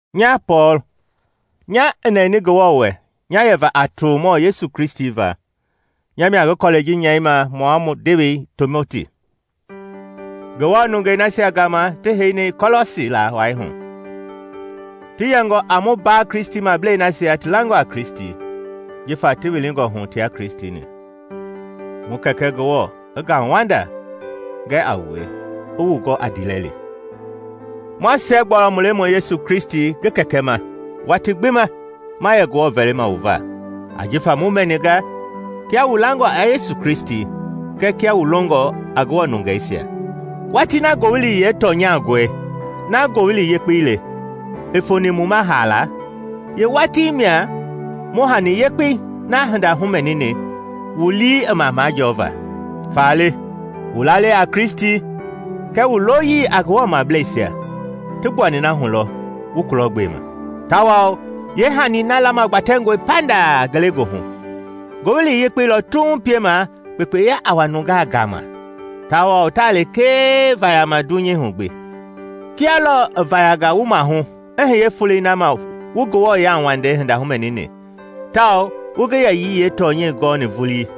Nya Pɔɔl, nya i nɛni Ngewɔ wɛ nya yɛva a tomɔ Yesu Kristi va, nya mia ngi kɔlɛi ji nyɛima mua mu ndewei Timoti, Ngewɔ nungei nasia gama ti heini Kɔlɔsi laa wai hu, ti yɛngɔ a mu mbaa Kristimablei nasia ti langɔ a Kristi, jifa ti wilingɔ hu tia Kristi-ni. Mu Kɛkɛ Ngewɔ i ngauwanda gɛ a wue i wu gɔ a ndiilɛli. Ma siɛgbualɔ mu Lemɔi Yesu Kristi ngi Kɛkɛ ma watii gbi ma yɛ Ngewɔ vɛlima wu va, ajifa mu mɛninga kia wu langɔ a Yesu Kristi kɛɛ kia wu longɔ a Ngewɔ nungeisia. Watii na Ngowili yeetɔnyangɔi, na Ngowili Yekpei le, i foni wu ma haala, yeewatii mia wu hani yekpei na hinda humɛnini wu lii i ma majɔɔva. Faale wu lalei a Kristi kɛɛ wu loyii a Ngewɔmableisia ti gbuani na hu lɔ wu kulɔgbema; tawao yeehanii na lamagbatɛngɔe pandaa ngelegoohu. Ngowili Yekpei lɔ tuuŋ piema kpekpeya a wa nungaa gama tawao taa lekee vayama dunyei hu gbi, kia lɔɔ i vayanga wu maahu i hiye folei na ma wu Ngewɔ yauwandei hinda humɛni, tawao wu ngi yɛyii yeetɔnyɛi gɔɔni vulii.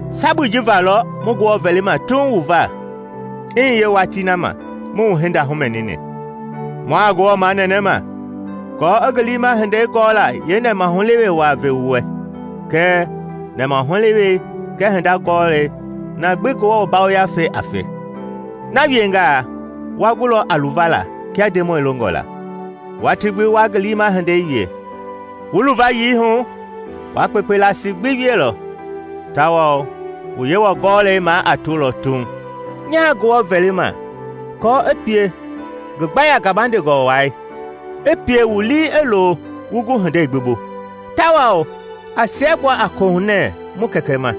Sabui ji va lɔ mu Ngewɔ vɛlima tuuŋ wu va i hiye watii na ma mu wu hinda humɛnini. Mua Ngewɔ manɛnɛma aako i ngi liima hindei gɔla yeenɛmahulewe waa ve wu wɛ, kɛɛ nɛmahulewei kɛɛ hinda hugɔɔlei na gbi Ngewɔ Yafei a fe. Na wiengaa wa gulɔ a luvala kia Ndemɔi longɔ la, watii gbi wa ngi liima hindei wie. Wu luvayii hu, wa kpekpe laasi gbi wielɔ, tawao wu Yewɔ gɔlɛi maa a tolɔ tuuŋ. Nyaa Ngewɔ vɛlima aako i pie ngi gbaya gabandengɔ wai i pie wu lii i lo wu gu hindei gbi bu. Tawao a siɛgbua a kohunɛ mu Kɛkɛ ma,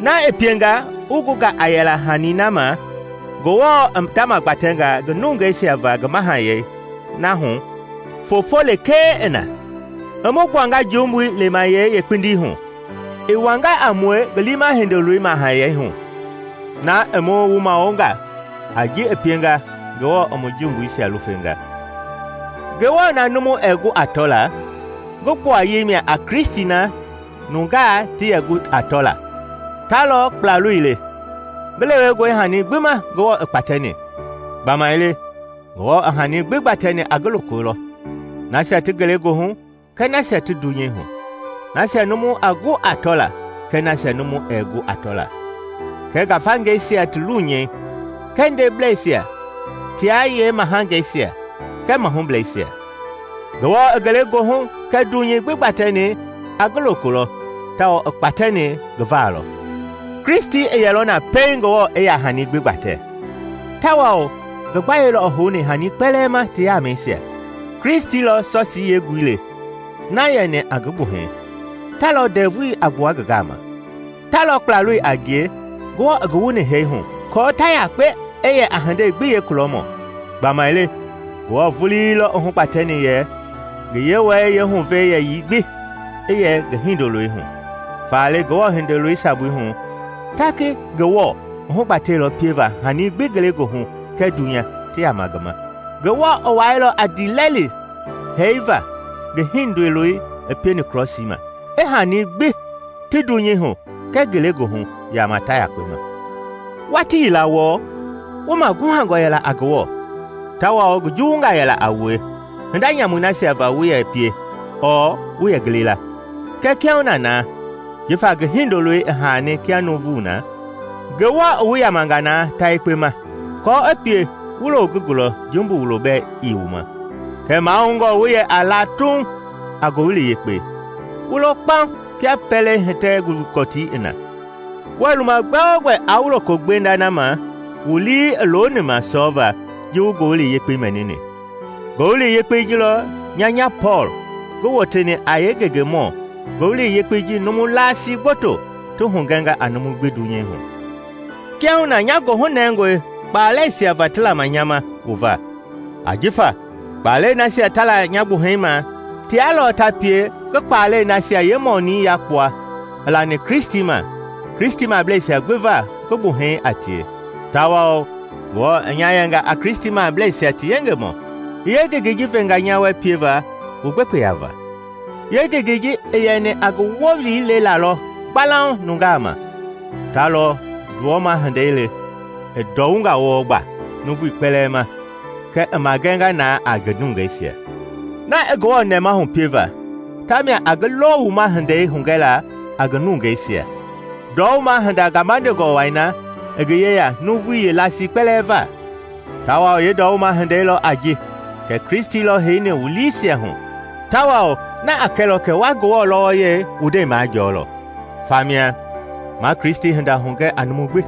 na i pienga wu gunga a yɛla hanii na ma Ngewɔ i ndamagbatɛnga ngi nungeisia va ngi mahayɛi na hu foofo lekee i na. I mu gbuanga jumbui lemayɛi yeekpindii hu, i wanga a mue ngi liima Hindoloi mahayɛi hu, na i mu wumawonga a ji i pienga Ngewɔ i mu jumbuisia lufenga. Ngewɔ na numu ɛɛ gu a tɔla, ngi gbuayei mia a Kristi na nungaa ti yɛ gu a tɔla. Ta lɔ Kplaloi le, ngi lewengɔ hani gbi ma Ngewɔ i kpatɛni. Gbamaile Ngewɔ i hanii gbi gbatɛni a ngi loko lɔ, nasia ti ngelegoohu kɛɛ nasia ti dunyei hu, nasia numu a gu a tɔla kɛɛ nasia numu ɛɛ gu a tɔla, kɛɛ ngafangeisia ti lunyɛi kɛɛ ndebleisia tia yeemahangeisia kɛɛ mahubleisia. Ngewɔ i ngelegoohu kɛɛ dunyei gbi gbatɛni a ngi loko lɔ tawao i kpatɛni ngi va lɔ. Kristi i yɛ na lɔ pɛiŋ Ngewɔ i yaa hani gbi gbatɛ, tawao ngi gbayei lɔ i houni hanii kpɛlɛɛ ma ti yɛmɛisia. Kristi lɔ sɔsii yeengui le na yɛni a ngi gbuhɛi; ta lɔ ndɛvui a gbua ngi gama. Ta lɔ Kplaloi a ngie Ngewɔ i ngi wuni hee hu aako ta yakpe i yɛ a hindei gbi yeekulɔmɔ. Gbamaile Ngewɔ vulii lɔ i hugbatɛni yɛ ngi Yewɔyɛi yeehuvɛi yɛyii gbi i yɛ ngi Hindoloi hu. Faale Ngewɔ Hindoloi sabui hu, ta ngi Ngewɔ i hugbatɛilɔ pieva hanii gbi ngelegoohu kɛɛ dunya ti yama ngi ma. Ngewɔ i wailɔ a ndiilɛli hee va ngi Hindoloi i pieni krɔsii ma, i hanii gbi ti dunyei hu kɛɛ ngelegoohu yama ta yekpe ma. Watii yila wɔɔ, wu maguhangɔ yɛla a Ngewɔ tawao ngi juwungaa yɛla a wue hinda nyamui nasia va wu yɛ pie ɔɔ wu yɛ gili la. Kɛɛ kiahuna na, jifa ngi Hindoloi i haani kia nuuvu na, Ngewɔ i wu yamanga na tayekpe ma, aako i pie wu loo ngi gulɔ jumbu wulo bɛɛ ii wu ma. Kɛɛ mahoungɔ wu yɛ a la tuuŋ a Ngowili Yekpei, wu lo kpaŋ kia pɛlei hitɛ gɔtii i na, wuɛɛ luma gbɛogbɛ aa wu loko gbenda na ma wu lii i loni ma sɔɔva ji wu Ngowili Yekpei mɛnini. Ngowili Yekpei ji lɔ nya nya Pɔɔl ngi woteni a yeengengemɔ Ngowili Yekpei ji numu laasi gboto ti hugɛnga a numu gbi dunyei hu. Kiahuna nya goohu nɛngɔe kpalɛisia va ti lama nya ma wu va, ajifa kpaalɛi nasia ta la nya gbuhɛi ma tia lɔ ta pie ngi kpaalɛi nasia yeemɔɔnii yakpua i lani Kristi ma Kristimableisia gbi va ngi gbuhɛi a tie. Tawao Ngewɔ i nya yɛnga a Kristimableisia ti yengemɔ, i yeengengei ji venga nya wɛ pieva wu gbekpeya va. Yeengengei i yɛni a ngi Wowili lelaa lɔ gbalauŋ nungaa ma, ta lɔ ndɔwuma hindei le i ndɔwunga wɔɔ gba nuuvui kpɛlɛɛ ma kɛɛ i magɛnga na a ngi nungeisia. Na i Ngewɔ nɛmahu pieva ta mia a ngi lɔwuma hindei hugɛla a ngi nungeisia, ndɔwuma-hinda gabandengɔ wai na i ngi yeya nuuvui yeelasii kpɛlɛɛ va. Tawao yeendɔwuma-hindei lɔ a ji kɛ Kristi lɔ heini wu liisia hu, tawao na a kɛlɔ kɛ wa Ngewɔ wɔlɔyei wu ndɛi majɔɔlɔ. Famia ma Kristi hinda hugɛ a numu gbi.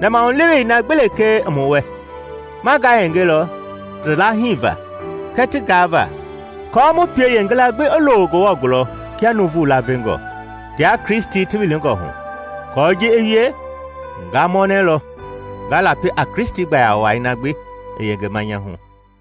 Nɛmahulewei na gbi lekee i mu wɛ, ma ngayengelɔ ti laahiva kɛɛ ti gaava aako mu pie yeengila gbi i lo Ngewɔ gulɔ kia nuuvu laavengɔ, tia Kristi ti wilingɔ hu. Aako ji i wie, nga mɔnɛlɔ, nga lapi a Kristi gbayawai na gbi i yengema nya hu.